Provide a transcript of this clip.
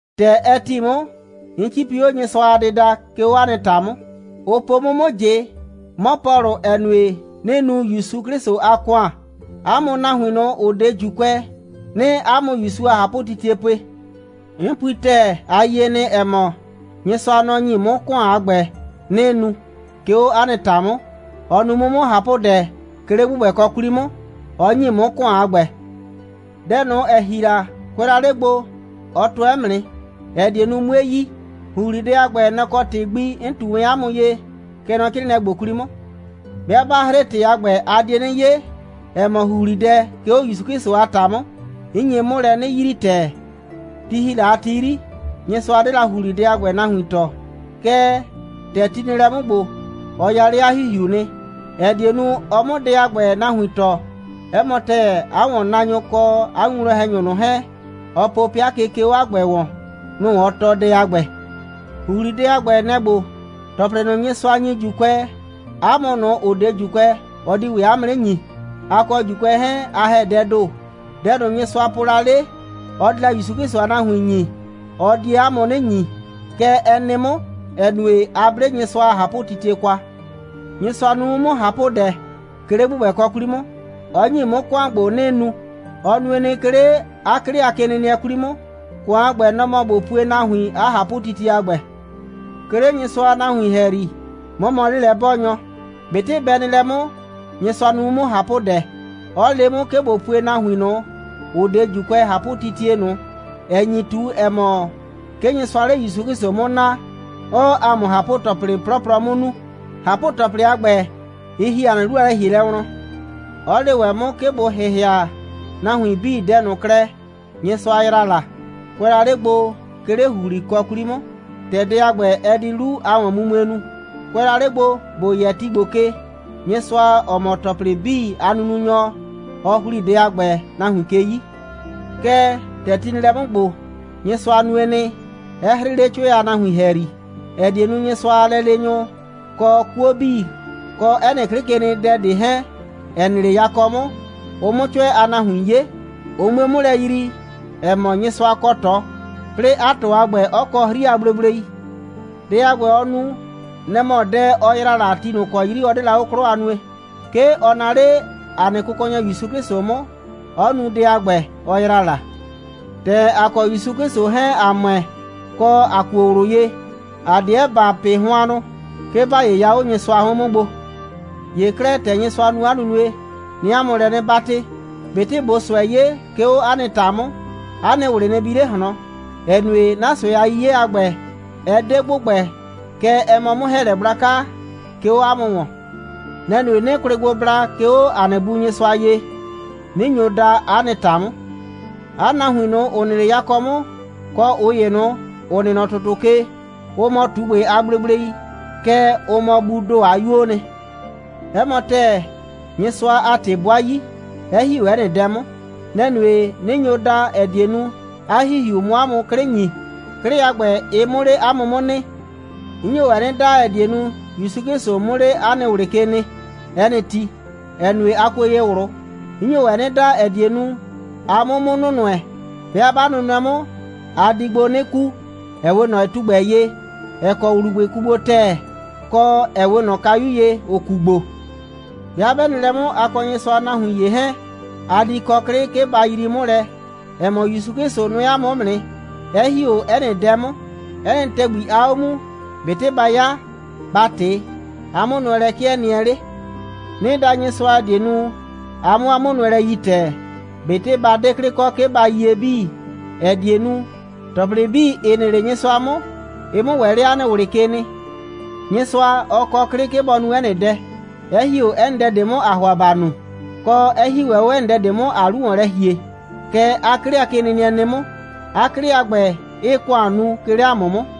‑Tɛ ɛ ‑ti 'mʋ, 'n 'cipi 'o Nyɩsʋa a dɩda, 'ke 'o 'a nɩ ‑ta 'mʋ. Ʋ po 'mʋ 'mʋ ꞊jɩ, 'mɔ Pɔlʋ, ‑ɛ nue, 'nɩɩ nu ‑Yusu 'Klɩsʋ a ‑kʋan, 'a mʋ nahuin ꞊nʋ, ‑ʋ 'de ‑Juukʋɛ, 'nɩɩ 'a mʋ ‑Yusu a ꞊hapʋtitie pue. 'N pui ‑tɛɛ, a yie nɩ, ‑ɛ mɔ, Nyɩsʋa, nɔ‑ ‑nyi 'mʋ ‑kʋan a ‑gbɛ, 'nɩɩ nu, 'ke 'o 'a nɩ ‑ta 'mʋ. Ɔ nu 'mʋ 'mʋ ꞊hapʋdɛ, 'ke 'le ‑gbʋgbɛkɔ 'kwli 'mʋ, 'ɔ ‑nyi 'mʋ ‑kʋan a ‑gbɛ. Dɛ ꞊nʋ, ‑ɛ ‑hli la, kʋɛ la 'le gbo, ɔ tʋɛ 'mʋ nɩ, ‑ɛ die nu, 'mue yi. ‑Huhlidɛ a ‑gbɛ, nɛ‑ kɔ ‑tɩ gbi 'n ꞊tu wɛn 'a mʋ ye, kɛ nɔ 'crɩɩnɩɛ ‑gbo 'kwli 'mʋ. 'Bɩa 'ba ‑hre ‑tɩ a ‑gbɛ, a die 'nɩ 'ye, ‑ɛ mɔ, ‑huhlidɛ 'ke 'o ‑Yusu 'Klɩsʋ a ‑ta 'mʋ, 'n nye 'mʋ lɛ 'nɩ yrii ‑tɛɛ. Ti ‑hi la a ti 'yri, Nyɩsʋa 'de la ‑huhlidɛ a ‑gbɛ nahuin tɔɔ. Kɛɛ, ‑tɛ ti nɩ lɛ 'mʋ ‑gbo, ɔ ya 'le 'a ‑Hihiu nɩ, ‑ɛ die nu, ɔ 'mʋ dɛ a ‑gbɛ nahuin tɔɔ. 'Ɛ mɔ ‑tɛɛ, 'a ‑wɔnnaanyʋ, kɔ 'a winwlɔn‑hɛnyʋ ꞊nʋ 'hɛɛn, ɔ po 'pɩa ke, 'ke 'o 'a ‑gbɛ ‑wɔn, nʋ‑ ɔ tɔɔ dɛ a ‑gbɛ. ‑Huhlidɛ a ‑gbɛ, nɛ‑ ‑gbo: ‑Tɔplɩ ꞊nʋ, Nyɩsʋa ‑nyi ‑Juukʋɛ, 'a mʋ ꞊nʋ, ‑ʋ 'de ‑Juukʋɛ, ɔ di ‑wɛ 'a mʋ 'nɩ ‑nyi. A kɔ ‑Juukʋɛ 'hɛɛn, a ‑hɛ dɛɛ ‑do. Dɛ ꞊nʋ, Nyɩsʋa po la 'le, ɔ di la ‑Yusu 'Klɩsʋ a nahuin ‑nyi, ɔ die 'a mʋ 'nɩ ‑nyi. Kɛ ɛ nɩ 'mʋ, ‑ɛ nue, a 'ble Nyɩsʋa a ꞊hapʋtitie kwa. Nyɩsʋa nu 'mʋ 'mʋ ꞊hapʋdɛ, 'ke 'le ‑gbʋgbɛkɔ 'kwli 'mʋ, 'ɔ ‑nyi 'mʋ ‑kʋan ‑gbo, 'nɩɩ nu. Ɔ nue nɩ, 'ke 'le 'a 'klɩ a kenɩnɩɛ 'kwli 'mʋ. ‑Kʋan a ‑gbɛ, nɔ‑ mɔ ꞊bo pue nahuin 'a ꞊hapʋtitie a ‑gbɛ. 'Ke 'le Nyɩsʋa a nahuin ‑hɛyri, 'mɔ mɔ 'lelɛ'bɔɔnyɔ. ꞊Betɩ bɛ nɩ lɛ 'mʋ, Nyɩsʋa nu 'mʋ 'mʋ ꞊hapʋdɛ, 'ɔ le 'mʋ, 'ke ꞊bo pue nahuin ꞊nʋ, ‑ʋ 'de ‑Juukʋɛ, ꞊hapʋtitie ꞊nʋ, ‑ɛ nyi ꞊tu, ‑ɛ mɔ, 'ke Nyɩsʋaa 'le ‑Yusu 'Klɩsʋ 'mʋ naa, 'ɔɔ ‑a mʋ ꞊hapʋ‑tɔplɩ 'plɔplɔ 'mʋ nu. ꞊Hapʋ‑tɔplɩ a ‑gbɛ, ɩ ‑hi ‑a nɩ 'lu a lɛ‑hielɛ wlɔn; 'ɔ le ‑wɛ 'mʋ, 'ke ꞊bo ‑hɩhɩa nahuin 'bii dɛ ꞊nʋ klɛ, Nyɩsʋa ‑yra la, kʋɛ la 'le gbo, 'ke 'le ‑huhlikɔ 'kwli 'mʋ, ‑tɛ dɛ a ‑gbɛ, ɛ di 'lu a ‑wɔnmumue nu. Kʋɛ la 'le gbo, ‑bo yɛ ti ‑gbo ke, Nyɩsʋa, ‑ɔ mɔ ‑tɔplɩ 'bii a nununyɔ, ɔ ‑hli dɛ a ‑gbɛ nahuin ke 'yi. Kɛɛ, ‑tɛ ti nɩ lɛ 'mʋ ‑gbo, Nyɩsʋa nue nɩ, 'ɛ 'hrɩɩ 'le 'cʋɛ a nahuin ‑hɛyri, ‑ɛ die nu, Nyɩsʋa a lɛleenyʋ, kɔ 'kuo 'bii, kɔ 'ɛ nɩ 'klɩkenɩdɛ ꞊de 'hɛɛn, ‑ɛ nɩ 'le yakɔ 'mʋ, ʋ 'mʋ 'cʋɛ a nahuin 'ye, ʋ 'mue 'mʋ lɛ yrii, ‑ɛ mɔ, Nyɩsʋa kɔ ꞊tɔ, 'plɩɩ 'a ꞊tɔ a ‑gbɛ 'ɔ kɔ 'hri a gblegblei. Dɛ a ‑gbɛ, ɔ nu, nɛ‑ mɔ dɛ, ɔ ‑yra la ti ꞊nʋ ‑kɔ 'yri ɔ 'de la 'o 'klɔ a nue. 'Ke ɔ naa 'le ‑a nɩ Kʋkɔnyɔ ‑Yusu 'Klɩsʋ 'mʋ, 'ɔ nu dɛ a ‑gbɛ, ɔ ‑yra la. ‑Tɛ ‑a kɔ ‑Yusu 'Klɩsʋ 'hɛɛn, ‑a ‑mʋɛ, kɔ, ‑a kuo ꞊wlʋ ye, ‑a 'deɛ ‑ba pɩ hʋannʋ, 'ke ‑ba 'yɩya 'o Nyɩsʋa 'hʋɩn 'mʋ gbo. ‑Ye 'klɛɛ, ‑tɛ Nyɩsʋa nu lɛ 'a nunue, 'nɩɩ 'a mʋ lɛ 'nɩ 'batɩ: ꞊Betɩ ꞊boo ꞊sʋɛ 'ye, 'ke 'o 'a nɩ ‑ta 'mʋ, 'a nɩ ꞊wlɩ nɩ bi 'le ꞊hlɔn, ‑ɛ nue, 'na ꞊sʋɛ a 'yiye a ‑gbɛ, ɛ 'de ‑gbʋgbɛ, kɛɛ, ɛ mɔ 'mʋ‑hɛɛlɛ gblaka, 'ke 'o 'a mʋ ‑wɔn. Nɛ‑ nue, 'nɩɩ kwlɩ gbo bla, 'ke 'o ‑a nɩ Bu Nyɩsʋa ye, 'nɩ nyo da 'a nɩ ‑ta 'mʋ. 'A nahuin ꞊nʋ, ‑ʋ nɩ 'le yakɔ 'mʋ, kɔ ꞊ʋ ‑ye ꞊nʋ, ‑ʋ nɩ nɔ ‑tʋtʋ ke, ʋ mɔ ꞊tugbɩ a gblegblei, kɛɛ, ʋ mɔ Buu ‑do a 'yuoo nɩ. 'Ɛ mɔ ‑tɛɛ, Nyɩsʋa a ‑tɩ 'bʋa 'yi, 'ɛ ‑hi 'o 'ɛ nɩ dɛ 'mʋ. Nɛ‑ nue, 'nɩ nyo da, ‑ɛ die nu, 'a ‑Hihiu 'mʋ 'a mʋ 'klɩ ‑nyi, 'klɩ a ‑gbɛ, ɩ 'mʋ 'le 'a mʋ 'mʋ nɩ. 'N nyo ‑wɛ 'nɩ da, ‑ɛ die nu, ‑Yusu 'Klɩsʋ 'mʋ 'le 'a nɩ ꞊wlɩ ke nɩ 'ɛ nɩ ti, ‑ɛ nue, a kuo ye ꞊wlʋ. 'N nyo ‑wɛ 'nɩ da, ‑ɛ die nu, a 'mʋ 'mʋ nʋnʋɛ. 'Bɩa 'ba nʋnʋɛ 'mʋ, a di gbo 'nɩ ku, ‑ɛ 'we ꞊nɔ tugbɛ ye, ‑ɛ kɔ ‑wlubʋɩ ku gbo ‑tɛɛ, kɔ, ‑ɛ 'we ꞊nɔ kayu ye, ‑ʋ ku gbo. 'Bɩa 'bɛ nɩ lɛ 'mʋ, a kɔ Nyɩsʋa a nahuin ‑ye 'hɛɛn, a di kɔ 'klɩ, 'ke ba yrii 'mʋ lɛ, ‑ɛ mɔ, ‑Yusu 'Klɩsʋ nʋɛ ‑a mʋ 'mʋ nɩ, 'ɛ ‑hi 'o 'ɛ nɩ dɛ 'mʋ. 'Ɛ nɩ ‑tɛgbi aa 'o muu, ꞊betɩ ba 'ya, ba ꞊tɩ, 'a 'mʋnʋɛlɛ 'kɩɛ nɩɛ 'le. 'Nɩɩ da Nyɩsʋa, ‑ɛ die nu, a 'mʋ 'a 'mʋnʋɛlɛ yi ‑tɛɛ, ꞊betɩ ba 'de 'klɩ kɔ, 'ke ba yie 'bii, ‑ɛ die nu, ‑tɔplɩ 'bii, ‑ɩ nɩ 'le Nyɩsʋa 'mʋ, ɩ 'mʋ ‑wɛ 'le 'a nɩ ꞊wlɩ ke nɩ. Nyɩsʋa, ɔ kɔ 'klɩ, 'ke bɔ nu 'ɛ nɩ dɛ, 'ɛ ‑hi 'o 'ɛ nɩ dɛ ꞊de 'mʋ, ‑aa ‑hʋa bɔ nu, kɔ, 'ɛ ‑hi ‑wɛ 'o 'ɛ nɩ dɛ ꞊de 'mʋ, ‑aa 'lu ‑wɔn lɛ ‑hie. Kɛ 'a 'klɩkenɩnɩɛ nɩ 'mʋ, 'a 'klɩ a ‑gbɛ 'ɩɩ ‑kʋan nu, 'ke 'le ‑a mʋ 'mʋ.